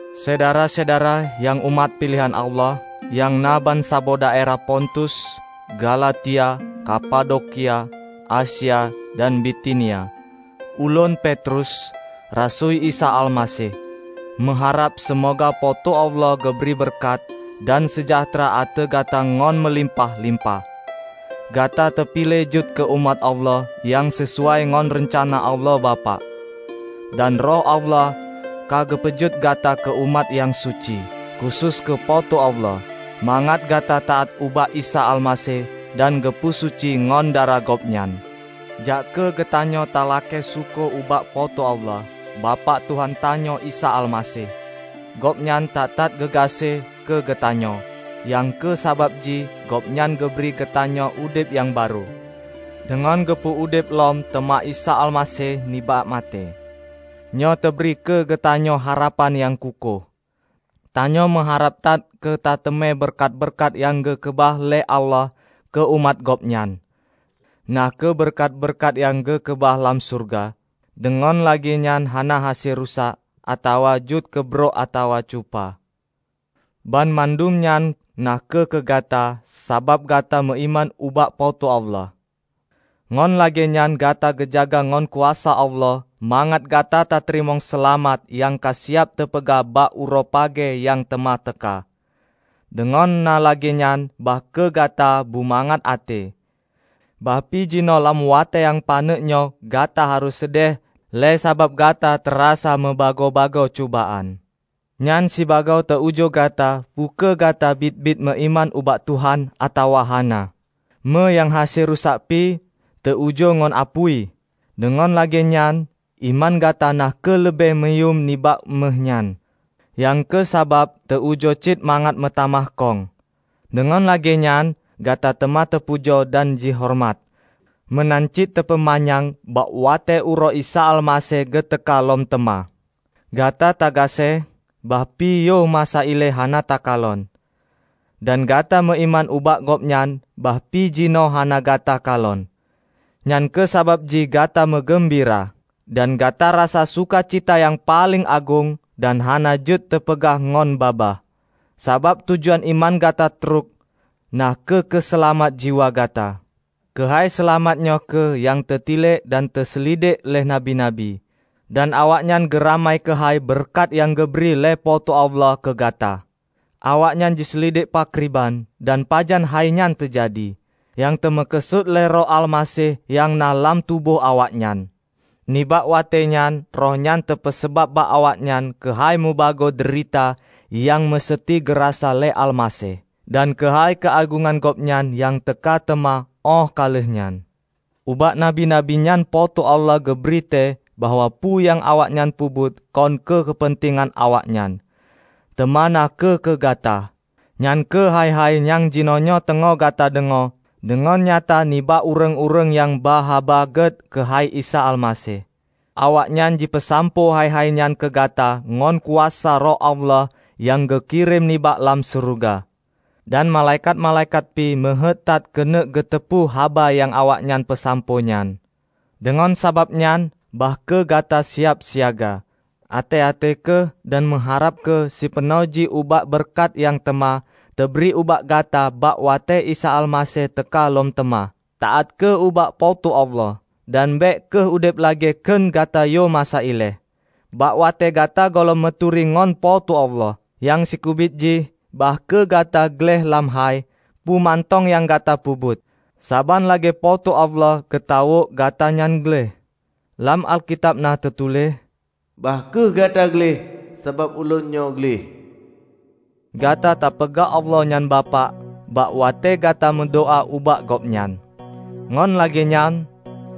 Syedara-syedara nyang umat piléhan Allah, nyang na bansaboh daerah Pontus, Galatia, Kapadokia, Asia dan Bitinia! Ulôn, Petrus, rasui Isa Almaseh, meuharab seumoga Po teu Allah geubri beureukat dan seujahteura ateueh gata ngon meulimpah-limpah. Gata teupiléh jeuet keu umat Allah nyang sisuai ngon reuncana Allah Bapak. Dan Roh Allah ka geupeujeuet gata keu umat nyang suci, khusos keu Po teu Allah, mangat gata taát ubak Isa Almaseh dan geupeu suci ngon darah Gobnyan. Jak kheueh geutanyoe talakée syukoe ubak Po teu Allah, Bapak Tuhan tanyoe Isa Almaseh! Gobnyan that-that geugaséh keu geutanyoe, nyang kheueh sabab jih Gobnyan geubri keugeutanyoe udeb nyang barô, deungon geupeu udeb lom teuma Isa Almaseh nibak maté. Nyoe teubri keu geutanyoe harapan nyang kukôh. Tanyoe meuharab that keutateumé beureukat-beureukat nyang geukeubah lé Allah keu umat Gobnyan, na kheueh beureukat-beureukat nyang geukeubah lam syeuruga, deungon lagée nyan hana hase rusak, atawa jeuet keu brok atawa cupa. Banmandum nyan na kheueh keu gata, sabab gata meuiman ubak Po teu Allah. Ngon lagée nyan gata geujaga ngon kuasa Allah mangat gata tateurimong seulamat nyang ka siyab teupeugah bak uroe pagée nyang teuma teuka. Deungon na lagée nyan bah kheueh gata bumangat até, bah pi jinoe lam watée nyang paneuk nyoe gata harôh seudeh le sabab gata tarasa meubagoe-bagoe cubaan. Nyan sibagoe teu ujoe gata peu kheueh gata biet-biet meuiman ubak Tuhan atawa hana. Méuh nyang hase rusak pi, teu ujoe ngon apui. Deungon lagée nyan, iman gata na kheueh leubeh muyuem nibak méuh nyan, nyang kheueh sabab teu-ujoe cit mangat meutamah kông. Deungon lagée nyan gata teuma teupujoe dan jihoreumat meunan cit teupeumanyang bak watée uroe Isa Almaseh geuteuka lom teuma. Gata tagaséh, bahpi yoh masa ilée hana takalon. Dan gata meuiman ubak Gobnyan bahpi jinoe hana gata kalon. Nyang kheueh sabab jih gata meugeumbira, dan gata rasa sukacita nyang paleng agong dan hana jeuet teupeugah ngon babah. Sabab tujuan iman gata trok, na kheueh keuseulamat jiwa gata. Keuhai seulamat nyoe kheueh nyang teutilek dan teuseulidek lé nabi-nabi, dan awaknyan geuramai keuhai beureukat nyang geubri lé Po teu Allah keu gata. Awaknyan jiseulidek pakriban dan pajan hainyan teujadi, nyang teumeukeusut lé Roh Almaseh nyang na lam tuboh awaknyan. Nibak watée nyan, Roh nyan teupeusabab bak awaknyan keuhai mubagoe deurita nyang meuseuti geurasa lé Almaseh dan keuhai keuagongan Gobnyan nyang teuka teuma óh ka lheueh nyan. Ubak nabi-nabi nyan Po teu Allah geubri tée bahwa peue nyang awaknyan peubuet kon keu keupeuntengan awaknyan, teuma na kheueh keu gata; nyan kheueh hai-hai nyang jinoenyoe teungoh gata deungoe deungon nyata nibak ureuëng-ureuëng nyang ba Haba Gét keuhai Isa Almaseh. Awaknyan jipeusampoe hai-hai nyan keugata ngon kuasa Roh Allah nyang geukirém nibak lam syeuruga. Dan malaikat-malaikat pih meuheuét that keuneuk geuteupeue haba nyang awaknyan peusampoe nyan. Deungon sabab nyan, bah kheueh gata siab siaga. Até-até kheueh dan meuharab kheueh sipeunoh jih ubak beureukat nyang teuma teubri ubak gata bak watée Isa Almaseh teuka lom teuma. Taát kheueh ubak Po teu Allah, dan bék kheueh udeb lagée kheun gata yoh masa ilée, bak watée gata gohlom meuturi ngon Po teu Allah. Nyang sikeubiet jih, bah kheueh gata gleh lam hai peue mantong nyang gata peubuet, saban lagée Po teu Allah geutawök gata nyan gleh. Lam Alkitab na teutuléh, "Bah kheueh gata gleh, sabab Ulôn nyoe gleh." Gata tapeugah Allah nyan Bapak bak watée gata meudoá ubak Gobnyan. Ngon lagée nyan,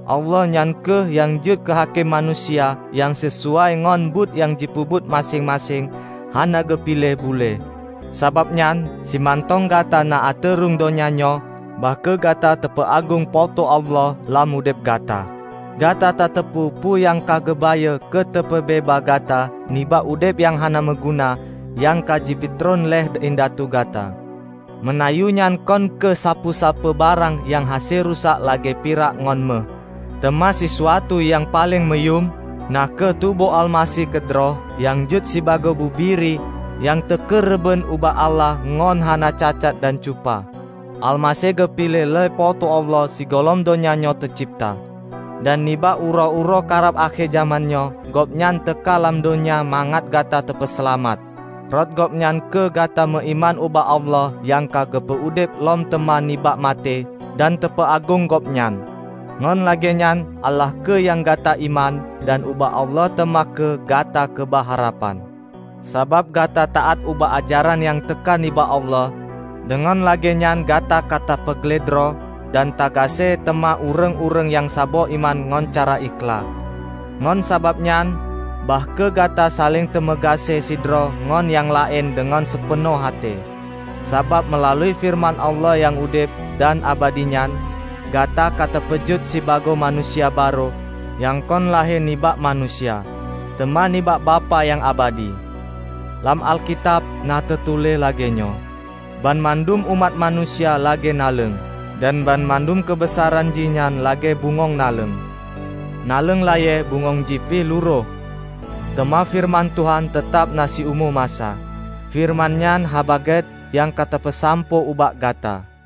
Allah nyan kheueh nyang jeuet keuhakém manusia nyang sisuai ngon buet nyang jipeubuet maséng-maséng hana geupiléh bulée. Sabab nyan, simantong gata na ateueh rhueng donya nyoe, bah kheueh gata tapeuagong Po teu Allah lam udeb gata. Gata tateupeu peue nyang ka geubayeue keuteupeubeubaih gata nibak udeb nyang hana meuguna nyang ka jipeutreun lé indatu gata. Meunayeue nyan kon kheueh sapeue-sapeue barang nyang hase rusak lagée pirak ngon méuh, teuma sisuatu nyang paleng meuyuem; na kheueh tuboh Almaseh keudroe, nyang jeuet sibagoe bubiri nyang teukeureubeuen ubak Allah ngon hana cacat dan cupa. Almaseh geupiléh lé Po teu Allah sigohlom donya nyoe teucebta. Dan nibak uroe-uroe karab akhé jamén nyoe, Gobnyan teuka lam donya mangat gata teupeuseulamat. Rot Gobnyan kheueh gata meuiman ubak Allah nyang ka geupeu udeb lom teuma nibak maté dan teupeuagong Gobnyan. Ngon lagée nyan, Allah kheueh nyang gata iman dan ubak Allah teuma kheueh gata keubah harapan. Sabab gata taát ubak ajaran nyang teuka nibak Allah, deungon lagée nyan gata ka tapeugleh droe dan tagaséh teuma ureuëng-ureuëng nyang saboh iman ngon cara ikhlaih. Ngon sabab nyan, bah kheueh gata saléng tameugaséh sidroe ngon nyang laén deungon sipeunoh até. Sabab meulalu feureuman Allah nyang udeb dan abadi nyan, gata ka teupeujeuet sibagoe manusia barô nyang kon lahé nibak manusia, teuma nibak Bapak nyang abadi. Lam Alkitab na teutuléh lagée nyoe, "Banmandum umat manusia lagée naleueng, dan banmandum keubeusaran jihnyan lagée bungöng naleueng. Naleueng layée, bungöng jih pih lurôh; teuma feureuman Tuhan teutab na siumu masa." Feureuman nyan Haba Gét nyang ka teupeusampoe ubak gata.